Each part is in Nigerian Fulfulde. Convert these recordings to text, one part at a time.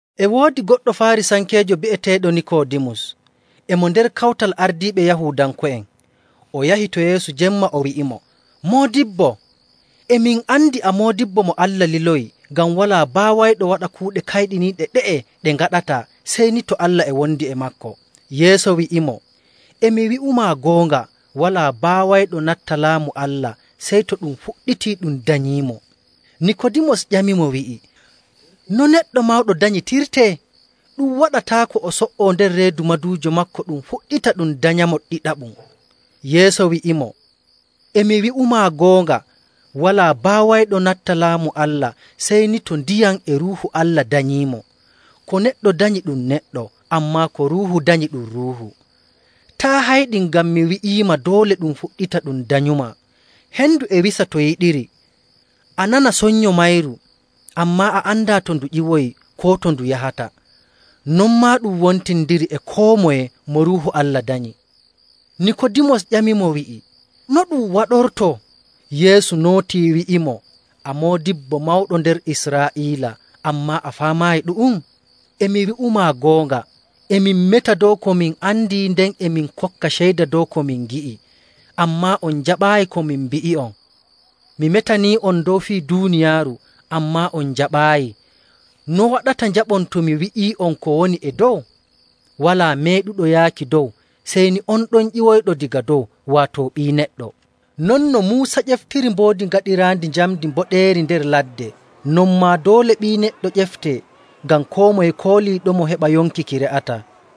E woodi goɗɗo Faarisankeejo bi'eteeɗo Nikoodimus, e mo nder kawtal ardiiɓe Yahuudanko'en. O yahi to Yeesu jemma, o wi'imo, “Moodibbo, e min andi a moodibbo mo Allah liloyi, ngam walaa baawayɗo waɗa kuuɗe kayɗiniiɗe ɗe'e ɗe ngaɗataa sey ni to Allah e wondi e maako.” Yeesu wi'imo, “E mi wi'umaa goonga, walaa baawayɗo natta Laamu Allah sey to ɗum fuɗɗitii ɗum danyiimo.” Nikoodimus ƴamimo wi'i, “No neɗɗo mawɗo danyitirtee? Ɗum waɗataako o so''o nder reedu maduujo maako ɗum fuɗɗita ɗum danyamo ɗiɗaɓum.” Yeesu wi'imo, “E mi wi'umaa goonga, walaa baawayɗo natta Laamu Allah sey ni to ndiyam e Ruuhu Allah danyiimo. Ko neɗɗo danyi ɗum neɗɗo, ammaa ko Ruuhu danyi ɗum ruuhu. Taa' hayɗin ngam mi wi'iima doole ɗum fuɗɗita ɗum danyumaa. Hendu e wisa to yiɗiri, a nana sonnyo mayru, ammaa a andaa to ndu ƴiwoyi koo to ndu yahata. Non maa ɗum wontindiri e koo moye mo Ruuhu Allah danyi.” Nikoodimus ƴamimo wi'i, “No ɗu'um waɗortoo?” Yeesu nootii wi'imo, “A moodibbo mawɗo nder Israa'iila, ammaa a faamaayi ɗu'um? E mi wi'umaa goonga, e min meta dow ko min andi, nden e min kokka ceyda dow ko min ngi'i, ammaa on njaɓaayi ko min mbi'i'on. Mi metanii'on dow fii duuniyaaru, ammaa on njaɓaayi. No waɗata njaɓon to mi wi'ii'on ko woni e dow? Walaa meeɗuɗo yaaki dow sey ni on ɗon ƴiwoyɗo daga dow, waato Ɓii Neɗɗo. “Non no Muusa ƴeftiri mboodi gaɗiraandi njamndi mboɗeeri nder ladde, non maa doole Ɓii Neɗɗo ƴeftee,. ngam koo moye kooliiɗomo heɓa yonki ki re'ataa.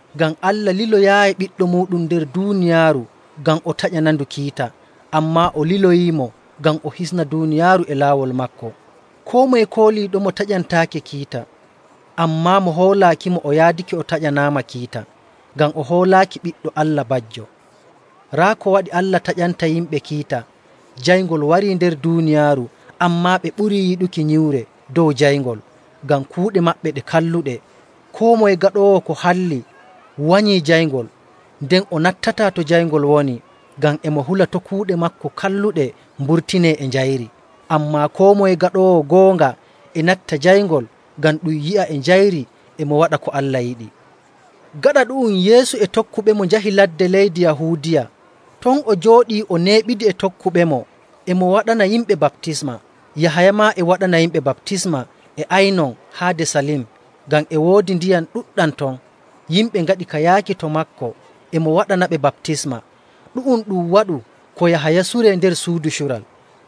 Ngam Allah liloyaayi Ɓiɗɗo muuɗum nder duuniyaaru ngam o taƴanandu kiita. Ammaa o liloyiimo ngam o hisna duuniyaaru e laawol maako. “Koo moye kooliiɗomo taƴantaake kiita, ammaa mo hoolaakimo o yaadake o taƴanaama kiita, ngam o hoolaaki Ɓiɗɗo Allah bajjo. Raa ko waɗi Allah taƴanta yimɓe kiita: jayngol warii nder duuniyaaru, ammaa ɓe ɓurii yiɗuki nyiwre dow jayngol, ngam kuuɗe maɓɓe ɗe kalluɗe. Koo moye gaɗoowo ko halli wanyii jayngol, nden o nattataa to jayngol woni, ngam e mo hula to' kuuɗe maako kalluɗe mburtinee e njayri. Ammaa koo moye gaɗoowo goonga e natta jayngol, ngam ɗum yi'a e njayri e mo waɗa ko Allah yiɗi.” Gaɗa ɗu'um, Yeesu e tokkuɓemo njahi ladde leydi Yahuudiya. Ton o jooɗii o neeɓidi e tokkuɓemo e mo waɗana yimɓe baptisma. Yahaya maa e waɗana yimɓe baptisma e Aynon haade Salim, ngam e woodi ndiyam ɗuɗɗam ton. Yimɓe ngaɗi ka yaaki to maako e mo waɗanaɓe baptisma. Ɗu'um ɗum waɗu ko Yahaya suree nder suudu cural..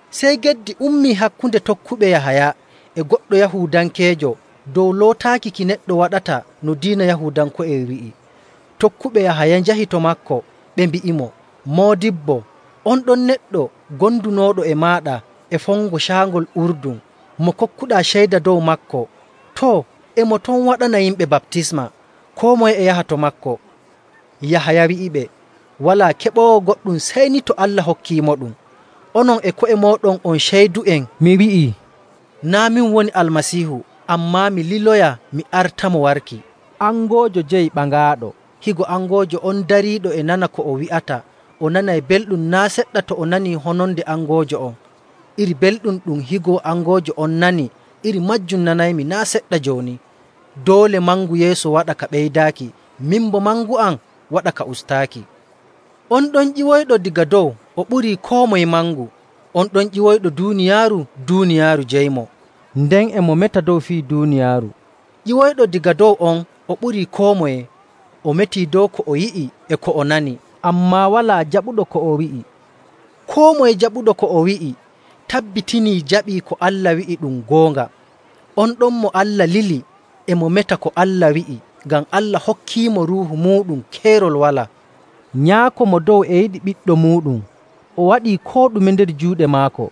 Sey geddi ummii hakkunde tokkuɓe Yahaya e goɗɗo Yahuudankeejo dow lootaaki ki neɗɗo waɗata no diina Yahuudanko'en wi'i. Tokkuɓe Yahaya njahi to maako ɓe mbi'imo, “Moodibbo, on ɗon neɗɗo gondunooɗo e maaɗa e fongo Caangol Urdun, mo kokkuɗaa ceyda dow maako, too, e mo ton waɗana yimɓe baptisma, koo moye e yaha to maako.” Yahaya wi'iɓe, “Walaa keɓoowo goɗɗum sey ni to Allah hokkiimoɗum. Onon e ko'e mooɗon on ceydu'en mi wi'ii, ‘Naa' min woni Almasiihu, ammaa mi liloya mi artamo warki.’. Angoojo jeyi ɓaŋaaɗo. Higo angoojo on dariiɗo e nana ko o wi'ata, o nanay belɗum naa' seɗɗa to o nanii hononde angoojo on. Iri belɗum ɗum higo angoojo on nani, iri maajum nanaymi naa' seɗɗa jooni. Doole mangu Yeesu waɗa ka ɓeydaaki, min boo mangu am waɗa ka ustaaki. “On ɗon ƴiwoyɗo daga dow o ɓurii koo moye mangu. On ɗon ƴiwoyɗo duuniyaaru, duuniyaaru jeyimo, nden e mo meta dow fii duuniyaaru. Ƴiwoyɗo daga dow on o ɓurii koo moye. O metii dow ko o yi'i e ko o nani, ammaa walaa jaɓuɗo ko o wi'i. Koo moye jaɓuɗo ko o wi'i tabbitinii jaɓii ko Allah wi'i ɗum goonga. On ɗon mo Allah lili, e mo meta ko Allah wi'i, ngam Allah hokkiimo Ruuhu muuɗum keerol walaa. Nyaako Mo Dow e yiɗi Ɓiɗɗo muuɗum, o waɗii koo ɗume nder juuɗe maako..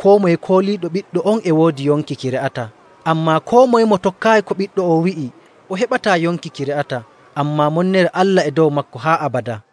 Koo moye kooliiɗo Ɓiɗɗo on e woodi yonki ki re'ataa. Ammaa koo moye mo tokkaayi ko Ɓiɗɗo on wi'i, o heɓataa yonki ki re'ataa, ammaa monnere Allah e dow maako haa abadaa.”